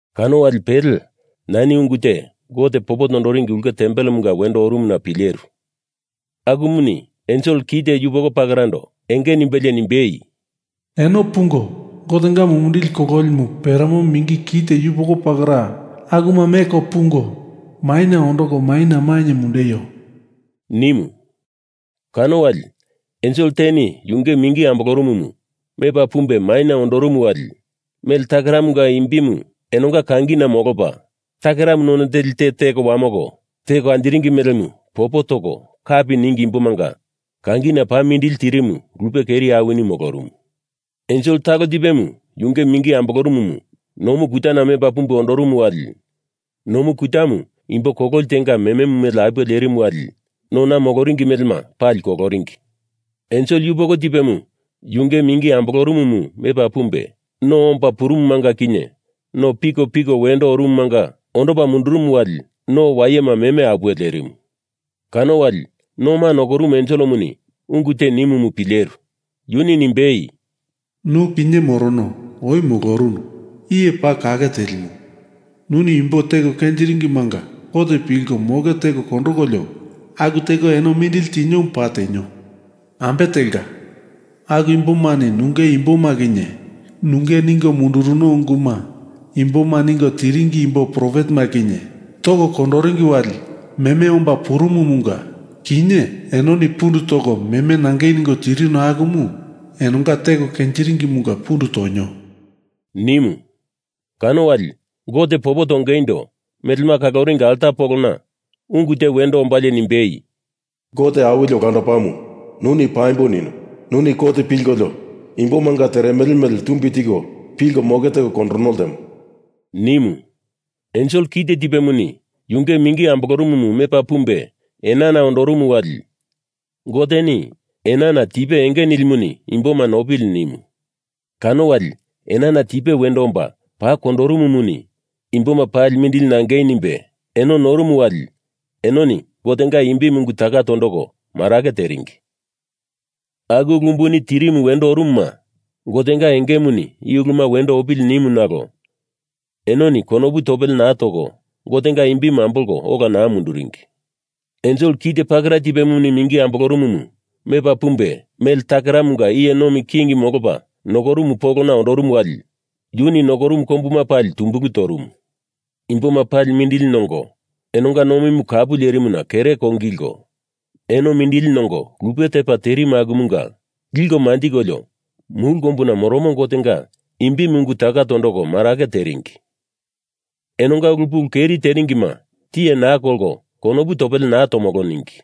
Kano wali pele nani ungu te Gote popo toringi ulke tempelemunga wendo orumuna pileru. Akumuni ensel kite yupoko pakerando enge nimbelie nimbei, “Eno pungo Gotenga mumindili kololimu peremo mingi kite yupoko pakera akuma meko pungo maina ondoko maina mainye mundeio!” nimu. Kano wali ensel teni yunge mingi ambolorumumu mepa pumbe maina ondorumu wali mele takeramunga imbimu enonga kangina molopa, takeramu none teli te teko wamoko teko anjiringi melemu popo toko kapi ningi imbomanga kangina paa mindili tirimu lupe keri awini molorumu. Ensel talo tipemu yunge mingi ambolorumumu nomu kutana mepa pumbe ondorumu wali nomu kutamu imbo kololi tenga mememu mele apuwe lerimu wali nona moloringi melema pali koloringi. Ensel yupoko tipemu yunge mingi ambolorumumu mepa pumbe no omba purumumanga kinye no pikopiko wendo orumumanga ondopa mundurumu wali no wayema meme apuwe lerimu. Kano wali noma nokorumu enselemuni ungu te nimumu pileru. Yuni nimbei, “Nu kinye morono, oi molorunu, iye paa kake telimu, nuni imbo teko kenjiringimanga kot pilko moke teko kondokolio aku teko eno mindili tiniomu paa tenio. Ambe telka, aku imbomani nunge imboma kinye nunge ningo munduruno unguma imboma ningo tiringi imbo profetema kinye toko kondoringi wali meme omba purumumunga kinye enoni pundu toko meme nangei ningo tirino akumu enonga teko kenjiringimunga pundu tonio,” nimu. Kano wali Gote popo tongeindo melema kaloringi alta polona ungu te wendo ombalie nimbei, “Gote Awili Olandopamu, nuni paimbo nino. Nuni kot pilkolio imboma teremele mele tumbi tiko pilko moke teko kondorono ltemo,” nimu. Ensel kite tipemuni yunge mingi ambolorumumu mepa pumbe enana ondorumu wali Goteni enana tipe enge nilimuni imboma nopili nimu. Kano wali enana tipe wendo omba paa kondorumumuni imboma paa mindili nangei nimbe eno norumu wali enoni Gotenga imbimu ungu taka tondoko marake teringi. Aku ulu umbuni tirimu wendo orumuma Gotenga engemuni i uluma wendo opili nimu nalo enoni konopu topele naa toko Gotenga imbimu ambolko ola naa munduringi. Ensel kite pakera tipemuni mingi ambolorumumu mepa pumbe mele takeramunga iye nomi king molopa nokorumu polona ondorumu wali yuni nokorumu kombuma pali tumbulu torumu. Imboma paa mindili nongo enonga nomimu kapu lerimuna kere kongilko, eno mindili nongo lupe tepa terimu akumanga liko manjikolio mulu kombuna moromo Gotenga imbimu ungu taka tondoko marake teringi. Enonga ulu pulu keri teringima tiye naa kolko konopu topele naa tomolo ningi.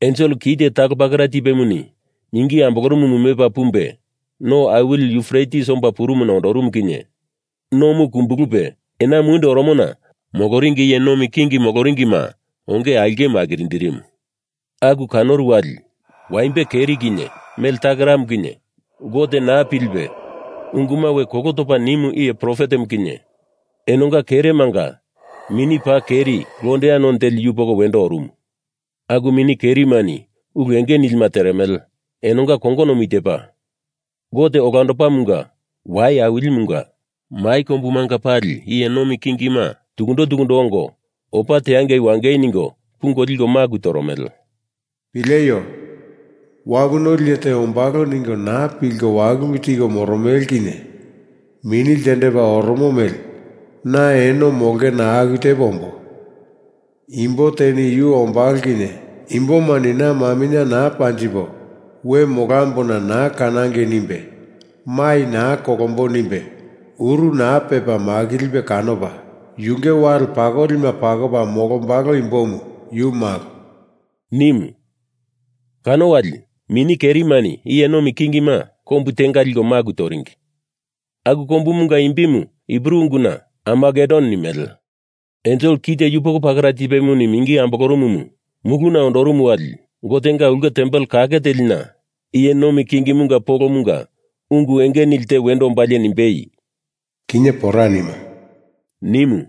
Ensel kite talo pakera tipemuni mingi ambolorumumu mepa pumbe no awili Yufretis omba purumuna ondorumu kinye nomu kumbulupe ena mundi oromona moloringi iye nomi king moloringima onge aulkemu akirindirimu. Aku kanoru wali waimbe keri kinye mele takeramu kinye Gote naa pilipe unguma we kolo topa nimu iye profetemu kinye enonga keremanga mini paa keri londea none teli yupoko wendo orumu. Aku mini kerimani ulu enge nilima teremele, enonga kongonomu i tepa: Gote Olandopamunga wai awilimunga mai kombumanga pali iye nomi kingima tukundo tukundo ongo opa teangei wangei ningo pungo liko maku toromele. “Pileio! Wapu noli iye te ombalo ningo naa pilko walulu tiko moromele kinye mini ltendepa oromo mele na eno molongena aku tepo ombo. Imbo teni yu ombalo kinye imbomani na maminye naa panjipo we molombona naa kanangei nimbe mai naa kolombo nimbe uru naa pepa makilipe kanopa, yunge wali pakolima pakopa molombalo imbomu yu malo,” nimu. Kano wali mini kerimani iye nomi kingima kombu tenga liko maku toringi, aku kombumunga imbimu Hibru unguna Armagedon nimele. Ensel kite yupoko pakera tipemuni mingi ambolorumumu muluna ondorumu wali Gotenga ulke tempel kake telina iye nomi kingimunga polomunga ungu enge nili te wendo ombalie nimbei, “Kinye pora nimo,” nimu.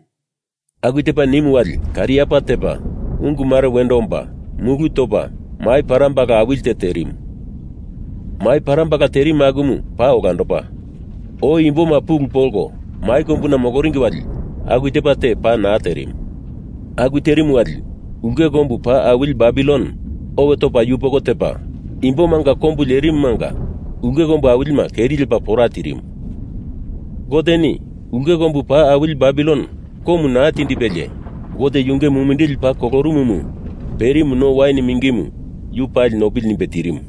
Aku tepa nimu wali kariapa tepa, ungu mare wendo omba, mulu topa, mai parambala awili te terimu. Mai parambala terimu akumu paa olandopa, oi imboma pulu polko mai kombuna moloringi wali aku tepa te paa naa terimu. Aku terimu wali ulke kombu paa awili Babilon owe topa yupoko tepa, imbomanga kombu lerimumanga ulke kombu awilima keri lepa pora tirimu. Goteni ulke kombu paa awili Babilon komu naa tindipelie Gote yunge mumindili paa kolorumumu perimu no wain mingimu yu pali nopili nimbe tirimu.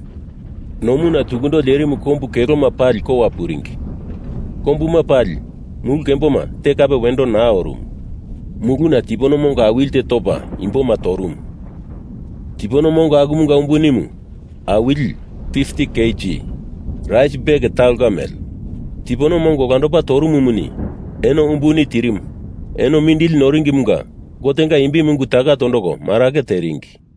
Nomuna tukundo lerimu kombu keloma pali kowa puringi. Kombuma pali mulu kembo te kape wendo naa orumu. Muluna tipono mongo awili tepa topa imboma torumu. Tipono mongo akumanga umbunimu awili (50kg) rais bek talonga mele. Tipono mongo olandopa torumumuni eno umbuni tirimu eno mindili noringimunga Gotenga imbimu ungu taka tondoko marake teringi.